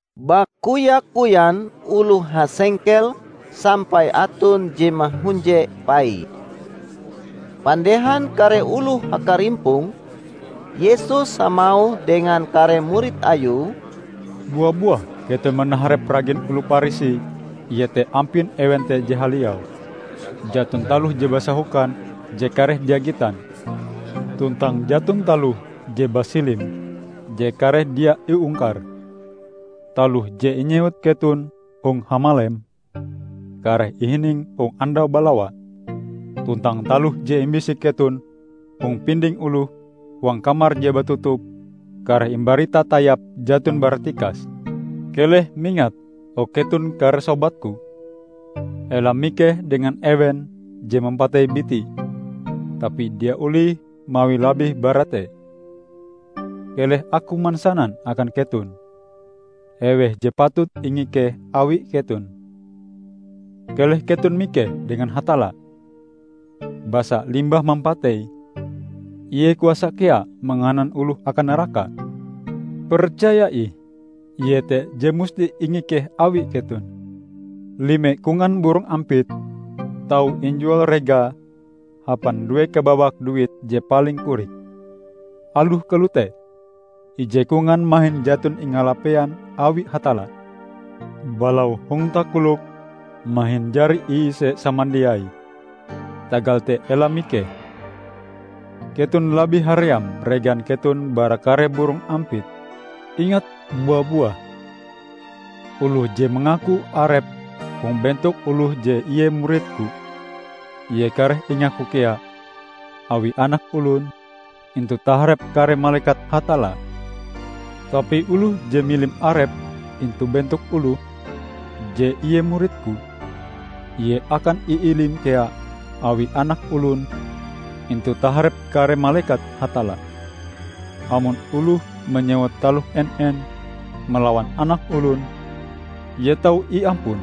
Bakoya-koyan oloh hasengkel sampai aton je mahunje paie. Pandehan kare oloh hakarimpong, Yesus hamauh dengan kare murid Ayue, "Bua-buah keton manaharep ragin oloh Parisi, iete ampin ewen te je haliau. Jaton taloh je basahokan je kareh dia gitan, tuntang jaton taloh je basilim je kareh dia iungkar. Taloh je inyewut keton hong hamalem, kareh ihining hong andau balawa; tuntang taloh je imbisik keton hong pinding oloh huang kamar je batutup, kareh imbarita tayap jaton bara tikas." "Keleh mingat, o keton kare sobat-Ku! Ela mikeh dengan ewen je mampatei biti tapi dia olih mawi labih bara te. Keleh Aku mansanan akan keton eweh je patut ingikeh awi keton. Keleh keton mikeh dengan Hatalla! Basa limbah mampatei, Ie kuasa kea manganan oloh akan naraka! Percaya ih, Ie te je musti ingikeh awi keton. Lime kongan burong ampit tau injual regae hapan due kabawak duit je paling korik. Aloh kalote, ije kongan mahin jaton ingalapean awi Hatalla. Balau hong takolokm mahin jari iise samandiaie, tagal te ela mikeh; keton labih haream regan keton bara kare burong ampit!" "Ingat bua-buah: Oloh je mangaku arepe hong bentok oloh je ie murid-Ku, ie kareh ingaku kea awi Anak Olon intu taharep kare malekat Hatalla. Tapi oloh je milim arepe intu bentok oloh, je ie murid-Ku, ie akan iilim kea awi Anak Olon intu taharep kare malekat Hatalla. Amon oloh manyewut taloh en-en malawan Anak Olon, ie tau iampun;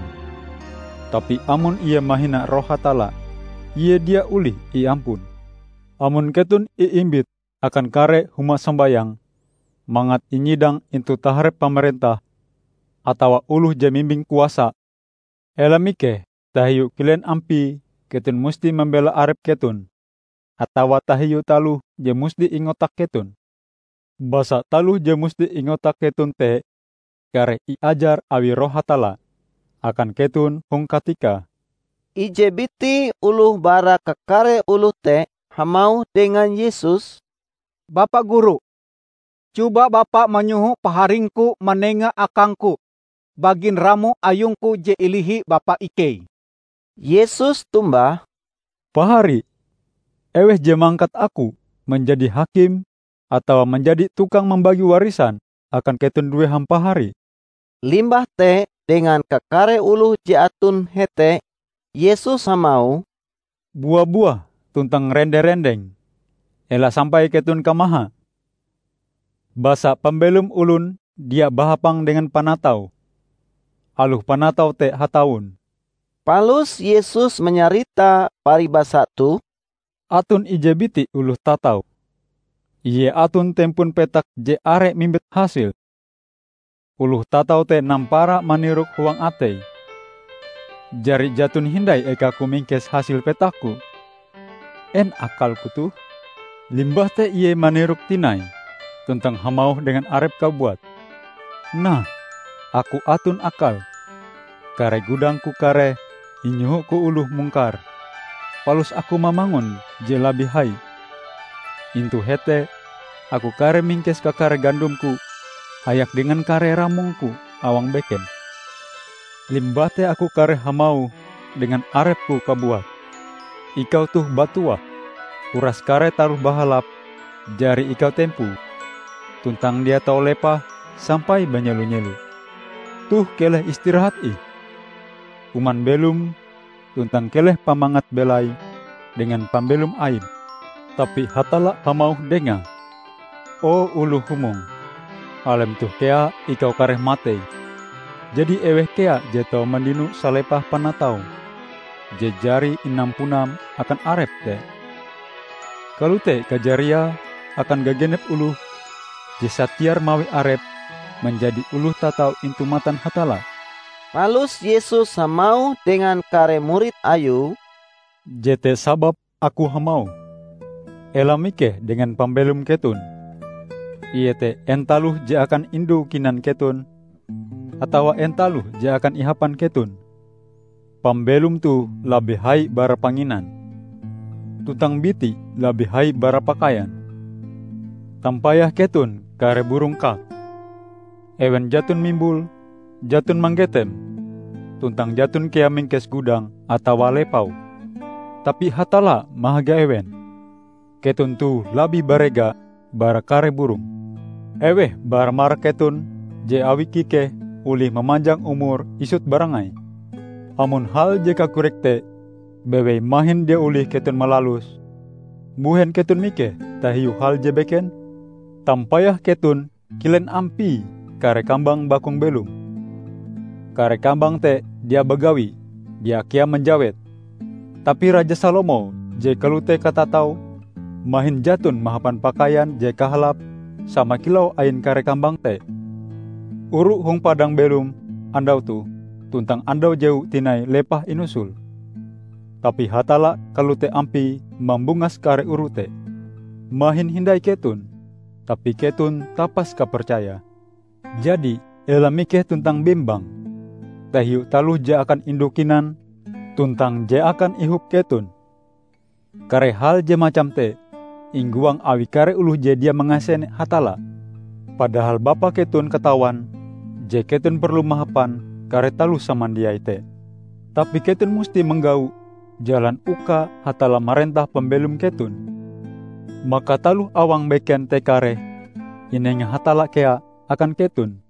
tapi amon ie mahina Roh Hatalla, ie dia olih iampun. Amon keton iimbit akan kare huma sombayang mangat inyidang intu taharep pamarentah atawa oloh je mimbing kuasa, ela mikeh tahiu kilen ampie keton musti mambela arep keton atawa tahiu taloh je musti ingotak keton. Basa taloh je musti ingotak keton te kareh iajar awi Roh Hatalla akan keton hong katikae." Ije biti oloh bara kakare oloh te hamauh dengan Yesus, "Bapa Guru, coba Bapa manyoho paharingku manenga akangku bagin ramo ayungku je ilihi bapa ikei." Yesus tombah, "Pahari, eweh je mangkat Aku manjadi hakim atawa manjadi tukang mambagi warisan akan keton due hampahari?" Limbah te dengan kakare oloh je aton hete Yesus hamauh, "Bua-buah tuntang rende-rendeng, ela sampai keton kamaha. Basa pambelom olon dia bahapang dengan panatau, aloh panatau te hatawon." Palus Yesus manyarita paribasa toh, "Aton ije biti oloh tatau. Ie aton tempon petak je are mimbit hasil. Oloh tatau te nampara manirok huang ateie, 'Jari jaton hindai ekaku mingkes hasil petakku. En akalku toh?' Limbah te ie manirok tinai tuntang hamauh dengan arepe kabuat, 'Nah, aku aton akal; kare gudangku kareh inyohoku oloh mungkare palus aku mamangun je labih hai. Intu hete aku kareh mingkes kakare gandomku hayak dengan kare ramongku awang beken. Limbah te aku kareh hamauh dengan arepku kabuat, ikau toh batuah! Uras kare taloh bahalap jari ikau tempoe tuntang dia tau lepah sampai banyelo-nyelo. Toh keleh istirahat ih! Kuman belom tuntang keleh pamangat belaim dengan pambelom aim!' Tapi Hatalla hamauh dengae, 'O oloh humong! Alem toh kea ikau kareh matei, jadi eweh kea je tau mandino salepah panataum je jari inampunam akan arepm te?' Kalote kajariae akan gagenep oloh je satiar mawi arepe manjadi oloh tatau intu matan Hatalla." Palus Yesus hamauh dengan kare murid Ayue, "Jete sababe Aku hamauh, 'Ela mikeh dengan pambelom keton, iete en taloh je akan indu kinan keton, atawa en taloh je akan ihapan keton.' Pambelom toh labih hai bara panginan, tuntang biti labih hai bara pakaian. Tampayah keton kare burong kak! Ewen jaton mimbul, jaton manggetem, tuntang jaton kea mingkes gudang atawa lepau. Tapi Hatalla mahaga ewen! Keton toh labih barega bara kare burong! Eweh bara marak keton je awi kikehe olih mamanjang umure isut barangai? Amon hal je kakorik te bewei mahin dia olih keton malaluse, mbuhen keton mikeh tahiu hal je beken? Tampayah keton kilen ampie kare kambang bakung belom; kare kambang te dia bagawi, dia kea manjawet. Tapi Raja Salomo je kalote katataue mahin jaton mahapan pakaian je kahalape sama kilau ain kare kambang te! Oru hong padang belom andau toh tuntang andau jewue tinai lepah inusol. Tapi Hatalla kalote ampie mambungas kare oru te. Mahin hindai keton! Tapi keton tapas kapercaya! Jadi ela mikeh tuntang bembang tahiu taloh je akan indu kinan tuntang je akan ihop keton. Kare hal je macam te inggoang awi kare oloh je dia mangasene Hatalla. Padahal Bapa keton katawan je keton perlu mahapan kare taloh samandiai te. Tapi keton musti manggau jalan uka Hatalla marentah pambelom keton, maka taloh awang beken te kareh inenga Hatalla kea akan keton."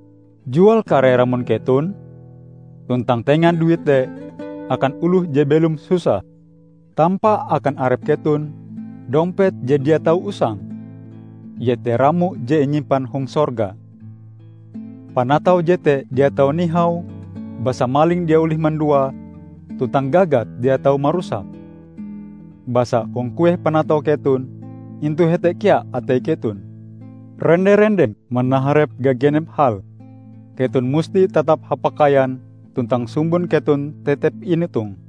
Jual kare ramon keton tuntang tenga duite akan oloh je belom susah. Tampa akan arep keton dompet je dia tau usang, iete ramo je inyimpan hong sorga. Panatau jete dia tau nihau basa maling dia olih manduae tuntang gagat dia tau marusake. Basa hong kueh panatau keton, intu hete kea atei keton!" "Rende-rendeng manaharep gagenep hal. Keton musti tatap hapakaian tuntang sumbon keton tetep inotong,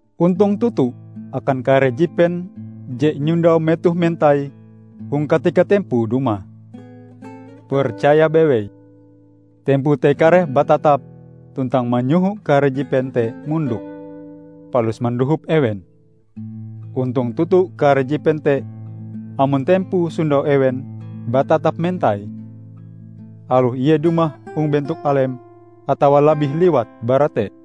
Ontong toto akan kare jipen je inyondau metohe mentai hong katika tempoe dumah. Percaya bewei: tempoe te kareh batatap tuntang manyoho kare jipen te mondok, palus mandohop ewen. Ontong toto kare jipen te amon tempoe sondau ewen batatap mentai, aloh ie dumah hong bentok alem atawa labih liwat bara te!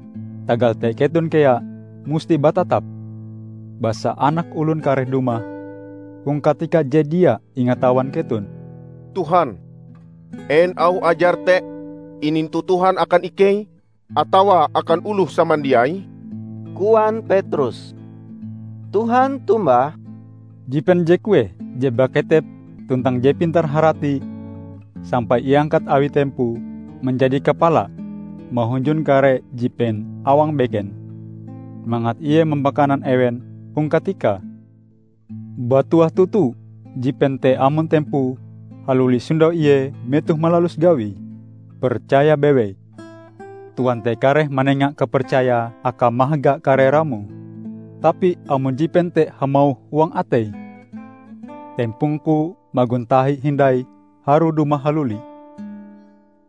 Tagal te keton kea musti batatap basa Anak Olon kareh dumah hong katika je dia ingatawan keton." "Tuhan en auh ajar te inintu Tuhan akan ikei atawa akan oloh samandiai?" koan Petrus. Tuhan tombah, "Jipen je kueh je baketep tuntang je pintar-harati sampai iangkat awi tempoe manjadi kapala mahunjun kare jipen awang beken mangat ie mampakanan ewen hong katikae? Batuah toto jipen te amon tempoe haluli sondau ie metohe malalus gawie! Percaya bewei: Tuan te kareh manenga kapercaya akae mahaga kare ramoe. Tapi amon jipen te hamauh huang ateie, 'Tempongku magon tahi hindai harue dumah haluli,'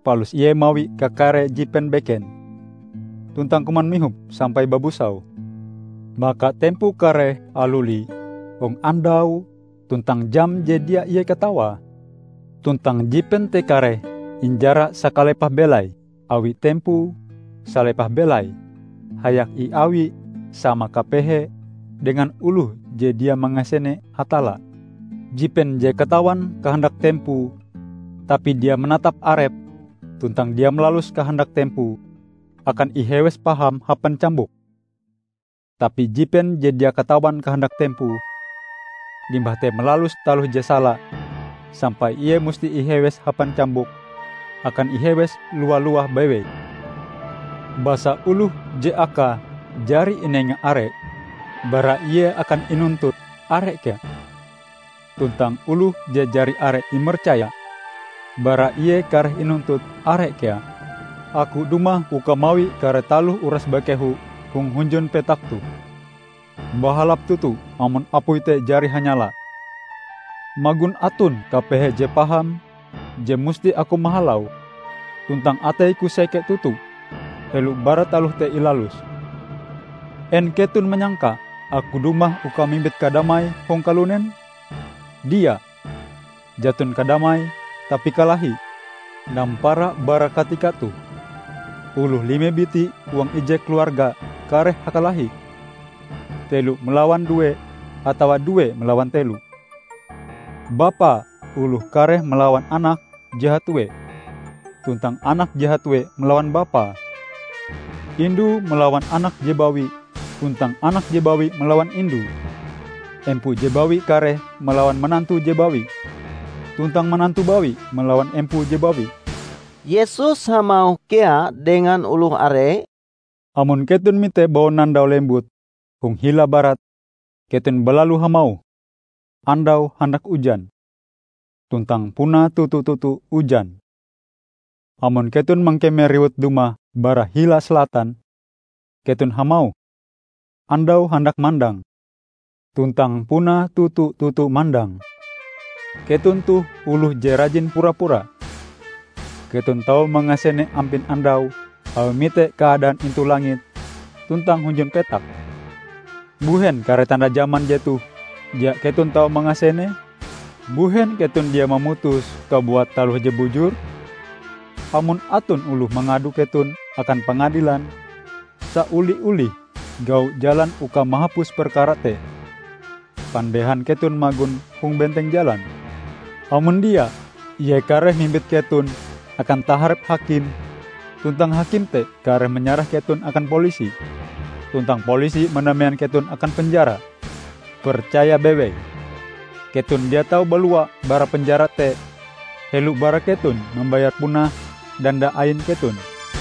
palus ie mawi kakare jipen beken tuntang kuman mihop sampai babusau, maka tempoe kareh haluli hong andau tuntang jam je dia ie katawae. Tuntang jipen te kareh injara sakalepah belai awi tempoe salepah belaie hayak iawie sama kapehee dengan oloh je dia mangasene Hatalla. Jipen je katawan kahandak tempoe, tapi dia manatap arepe tuntang dia malalus kahandak tempoe, akan ihewes paham hapan cambuk. Tapi jipen je dia katawan kahandak tempoe, limbah te malalus taloh je sala sampai ie musti ihewes hapan cambuk, akan ihewes lowa-lowah bewei. Basa oloh je akae jari inenga are, bara ie akan inuntut are kea. Tuntang oloh je jari are imercaya, bara ie kareh inuntut are kea." "Aku dumah uka mawi kare taloh uras bakeho hong hunjun petak toh. Bahalap toto amon apui te jari hanyala! Magon aton kapehe je paham je musti Aku mahalaue. Tuntang atei-Ku seke toto helo bara taloh te ilalus. En keton manyangka Aku dumah uka mimbit kadamai hong kalunen? Dia, jaton kadamai, tapi kalahi. Nampara bara katika toh, oloh lime biti huang ije keluarga kareh hakalahi, telo malawan due atawa due malawan telo. Bapa oloh kareh malawan anake je hatue tuntang anake je hatue malawan bapae. Indue malawan anake je bawi tuntang anake je bawi malawan indue. Empoe je bawi kareh malawan manantue je bawi tuntang manantu bawi malawan empoe je bawi." Yesus hamauh kea dengan oloh are, "Amon keton mite baunandau lembut hong hila barat, keton balalu hamauh, 'Andau handak ujan.' Tuntang puna toto-toto ujan. Amon keton mangkeme riwut dumah bara hila salatan, keton hamauh, 'Andau handak mandang.' Tuntang puna toto-toto mandang Keton toh oloh je rajin pura-pura! Keton tau mangasene ampin andau awi mite keadaan intu langit tuntang hunjun petak. Mbuhen kare tanda jaman jetoh dia keton tau mangasenee?" "Mbuhen keton dia mamutus kabuat taloh je bujur? Amon aton oloh mangado keton akan pangadilan, saoli-olih gau jalan uka mahapus perkara te pandehan keton magon hong benteng jalan. Amon dia, ie kareh mimbit keton akan taharep hakim tuntang hakim te kareh manyarah keton akan polisi, tuntang polisi manamean keton akan penjara. Percaya bewei! Keton dia tau balua bara penjara te helo bara keton mambayar punah danda ain keton."